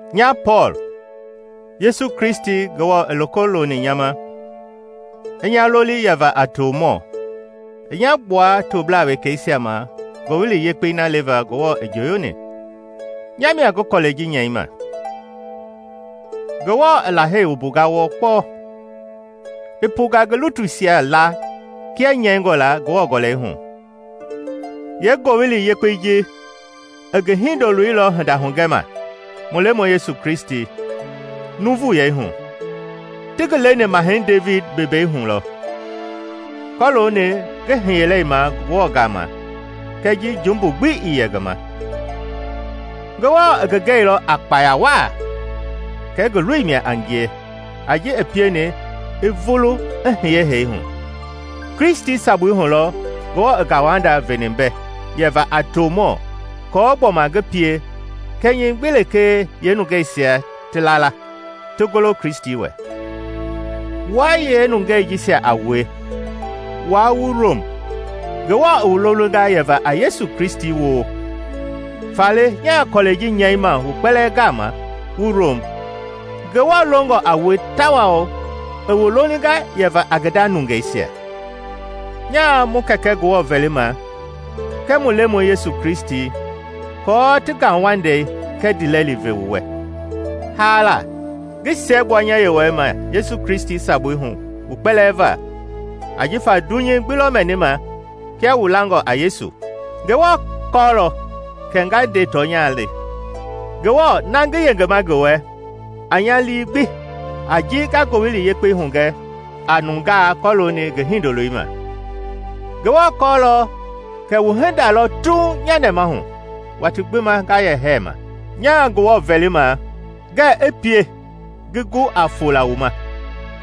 Nya Pɔɔl, Yesu Kristi Ngewɔ i loko loni nya ma, i nya loli yɛva a tomɔ, i nya gbua toblaa wekeisia ma Ngowili Yekpei na leva Ngewɔ i njooyoni, nya mia ngi kɔlɛi ji nyɛima. Ngewɔ i Lahei wumbunga wɔɔ kpɔɔ, i punga ngi lutuisia laa kia nyɛingɔ la Ngewɔ Gɔlɛi hu. Yeengowili Yekpei ji i ngi Hindoloi lɔ hinda hugɛma, mu Lemɔi Yesu Kristi; nuuvuyei hu, ti ngi leni Mahɛi Devidi bembei hu lɔ; kɔlooni ngi hiyelei ma Ngewɔ gama kɛɛ ji jumbu gbi ii yɛ ngi ma, Ngewɔ i ngi gɛilɔ a kpaya waa kɛ ngi Loi mia a ngie a ji i pieni i vulu i hiye hee hu. Kristi sabui hu lɔ Ngewɔ i ngauwanda veni mbɛ yɛva a tomɔ aako gbɔma ngi pie kɛnyɛ gbi lekee yeenungeisia ti la la, ti golo Kristi wɛ. Wua yeenungei jisia a wue, wua wu Rom, Ngewɔ i wu lolinga yɛva a Yesu Kristi woo. Faale nyaa kɔlɛi ji nyɛima wu kpɛlɛɛ gama wu Rom Ngewɔ longɔ a wue tawao i wu lolinga yɛva a ngi nda nungeisia: Nyaa mu Kɛkɛ Ngewɔ vɛlima kɛɛ mu Lemɔi Yesu Kristi aako ti ngauwandei kɛɛ ndiilɛli ve wu wɛ. Haala, ngi siɛgbua nya Yewɔɛi ma Yesu Kristi sabui hu wu kpɛlɛɛ va; ajifa dunyei gbi lɔ mɛnima kia wu langɔ a Yesu. Ngewɔ kɔɔlɔ kɛ na nga nde tɔnya le, Ngewɔ na ngi yengema ngi wɛ a nya lii gbi a ji nga Ngowili Yekpei hugɛ a nungaa kɔlooni ngi Hindoloi ma. Ngewɔ kɔɔlɔ kɛ wu hinda lɔ tuuŋ nya nɛmahu watii gbi nga yɛ hɛɛma. Nyaa Ngewɔ vɛlima ngɛɛ i pie ngi gu a fola wu ma.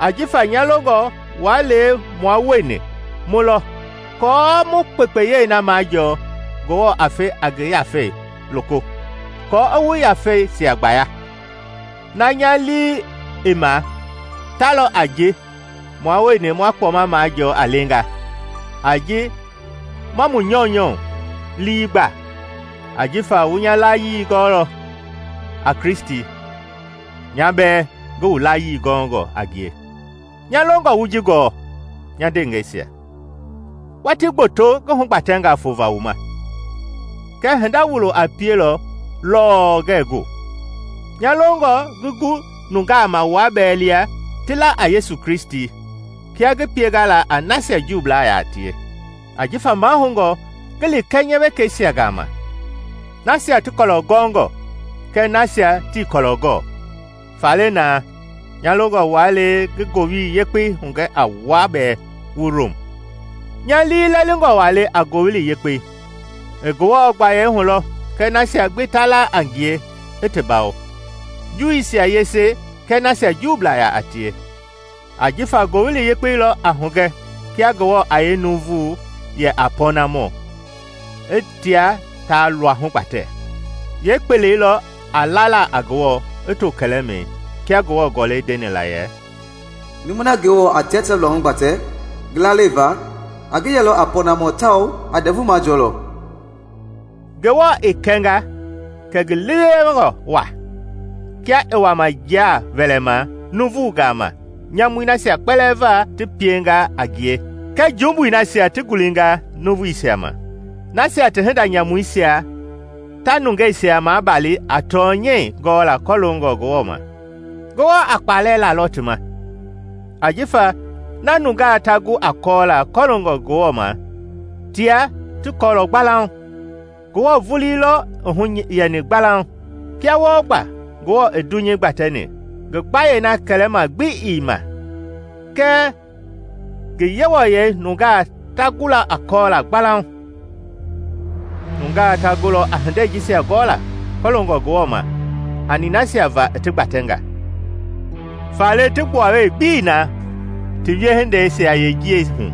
Ajifa nya longɔ waa le mua wueni mu lɔ aako wu kpekpeyei na majɔɔ Ngewɔ a fe a ngi Yafei loko aako i wu yafeisia gbaya. Na nya lii i ma ta lɔ a ji mua wueni ma kpɔma majɔɔ a lenga a ji ma mu nyɔunyɔ lii gba ajifa wu nya layii gɔɔlɔ a Kristi, nya bɛɛ ngi wu layii gɔngɔ a ngie. Nya longɔ wu ji gɔɔ, nya ndeengɛisia; watii gboto ngi hugbatɛnga fova wu ma, kɛɛ hinda wulo a pielɔ lɔɔ ngɛɛ gu. Nya longɔ ngi gu nungaa ma wua bɛɛ lia ti la a Yesu Kristi kia ngi pienga la a nasia Juublaa yaa tie. Ajifa mahoungɔ ngi li kɛnyɛwekɛisia gama, nasia ti kɔlɔ gɔngɔ kɛɛ nasia tii kɔlɔ gɔɔ. Faale na, nya longɔ waa le ngi Ngowili Yekpei hugɛ a wua bɛɛ wu Rom. Nya liilɛlingɔ waa le a Ngowili Yekpei; i Ngewɔ gbaye hulɔ kɔ nasia gbi ta laa a ngie i ti bawo, Juuisia yese kɛɛ nasia Juublaa yaa tie. Ajifa Ngowili Yepkei lɔ a hugɛ kia Ngewɔ a yee nuuvu yɛ a pɔɔnamɔ i tia ta luahu gbatɛ: yeepelei lɔ a lala a Ngewɔ i too kɛlɛmɛi. Kia Ngewɔ Gɔlɛi ndeni la yɛ, “Numui na Ngewɔ a tia ta luahu gbatɛ ngi lalei va, a ngi yɛlɔ a pɔɔnamɔ tawao a ndɛvu majɔɔlɔ.” Ngewɔ i kɛnga, kɛ ngi liilewengɔ waa, kia i wama njia wɛlɛma nuuvungaa ma nyamui nasia kpɛlɛɛ va ti pienga a ngie kɛɛ jumbui nasia ti ngulinga nuuvuisia ma; nasia ti hinda nyamuisia ta nungeisia maabali a tɔnyɛi gɔla kɔloongɔ Ngewɔ ma. Ngewɔ a kpalɛ lalɔ ti ma, ajifa na nungaa ta gu a kɔɔla kɔloongɔ Ngewɔ ma tia ti kɔɔlɔ gbalauŋ, Ngewɔ vulii lɔ i hu yɛni gbalauŋ. Kia wɔɔ gba Ngewɔ i dunyei gbatɛni, ngi gbayei na kɛlɛma gbi ii ma kɛɛ ngi Yewɔyɛi nungaa ta gulɔ a kɔɔla gbalauŋ. Nungaa ta gulɔ a hindei jisia gɔla kɔloongɔ Ngewɔ ma hani nasia va i ti gbatɛnga. Faale ti gbuawee gbi ii na ti wiehindeisia yeenjiɛi hu.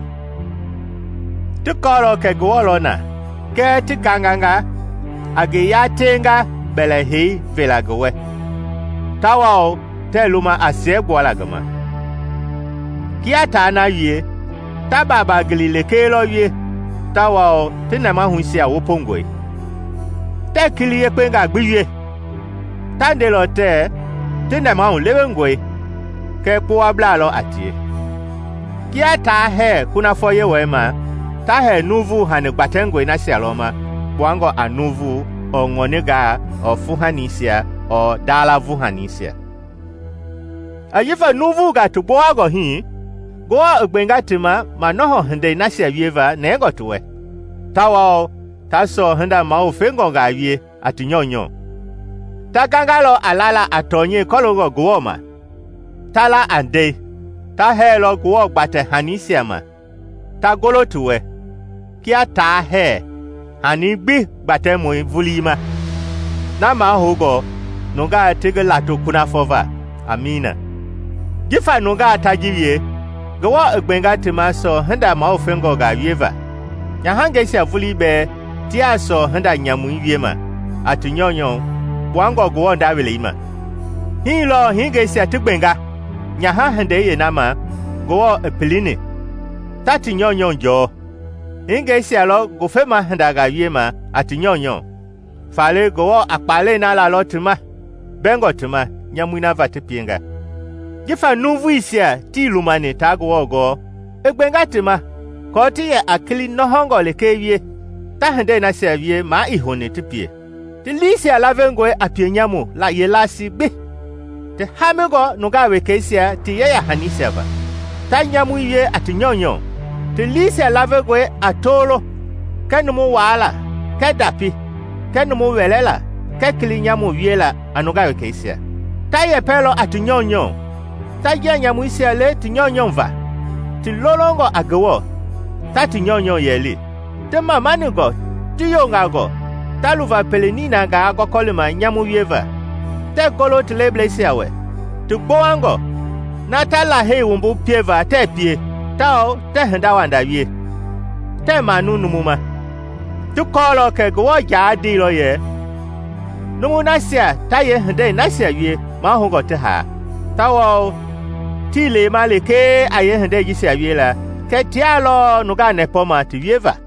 Ti kɔɔlɔ kɛ Ngewɔ lɔ na kɛɛ ti ganganga a ngi yaateenga bɛlɛhei vela ngi wɛ tawao tɛɛ luma a siɛgbualaa ngi ma. Kia taa na wie, ta baaba gili lekee lɔ wie tawao ti nɛmahuisia wopongɔe, tɛɛ kili yekpengaa gbi wie. Ta ndelɔ tɛɛ ti nɛmahu lewengɔe kɛɛ kpowablaa lɔ a tie. Kia taa hɛɛ kunafɔ Yewɔɛi ma, ta hɛɛ nuuvu hani gbatɛngɔi nasia lɔ ma kpuangɔ a nuuvu ɔɔ ŋɔningaa ɔɔ fuuhanisia ɔɔ ndala-vuuhanisia. Jifa nuuvugaa ti gbowangɔ hii, Ngewɔ i gbenga ti ma manɔhɔ hindei nasia wieva nɛngɔ ti wɛ, tawao ta sɔɔ hinda mawufengɔngaa wie a ti nyɔunyɔ. Ta gangalɔ a lala a tɔnyɛi kɔloongɔ Ngewɔ ma, ta la a ndɛi; ta hɛɛlɔ Ngewɔ gbatɛhanisia ma ta golo ti wɛ kia taa hɛɛ hanii gbi gbatɛmɔi vulii ma, na mahoungɔ nungaa ti ngi lato kunafɔ va! Amiina. Jifa nungaa ta ji wie, Ngewɔ i gbenga ti ma sɔɔ hinda mawufengɔngaa wieva. Nyahangɛisia vulii bɛɛ tiaa sɔɔ hinda nyamui wiema a ti nyɔunyɔ kpuangɔ Ngewɔ nda welei ma. Hii lɔɔ hingeisia ti gbenga nyaha-hindei yeena ma Ngewɔ i pilini, ta ti nyɔunyɔ jɔɔ, hingeisia lɔ ngufema hindangaa wiema a ti nyɔunyɔu, faale Ngewɔ a kpalɛi na lalɔ ti ma mbɛngɔ ti ma nyamui na va ti pienga. Jifa nuuvuisia tii lumani taa Ngewɔ gɔɔ, i gbenga ti ma aako ti yɛ a kili nɔhɔngɔ lekee wie, ta hindei nasia wie maa ii houni ti pie. Ti liisia lavengɔe a pienyamu yeelasii gbi, ti haamingɔ nungaa wekeisia ti yeya-hanisia va, ta nyamui wie a ti nyɔunyɔ; ti liisia lavengɔe a tolo kɛɛ numu waala kɛɛ ndapi kɛɛ numu wɛlɛlaa kɛɛ kili nyamu wiela a nungaa wekeisia. Ta yɛpɛlɔ a ti nyɔunyɔ, ta njia nyamuisia le ti nyɔunyɔ va, ti lolongɔ a Ngewɔ, ta ti nyɔunyɔu yɛli, ti mamaningɔ, ti yongangɔ; ta luva pele ninangaa gɔlima nyamu wieva: tɛɛ golo ti leblɛisia wɛ; ti gbowangɔ; na ta lahei wumbu pieva tɛɛ pie, tawao tɛɛ hindawanda wie, tɛɛ manu numu ma. Ti kɔlɔ kɛ Ngewɔ jaa ndeilɔ yɛ numu nasia ta yee hindei nasia wie mahoungɔ ti haa. Tawao tii lema lekee a yeehindei jisia wiela, kɛɛ tia lɔɔ nungaa nɛpɔma ti wieva.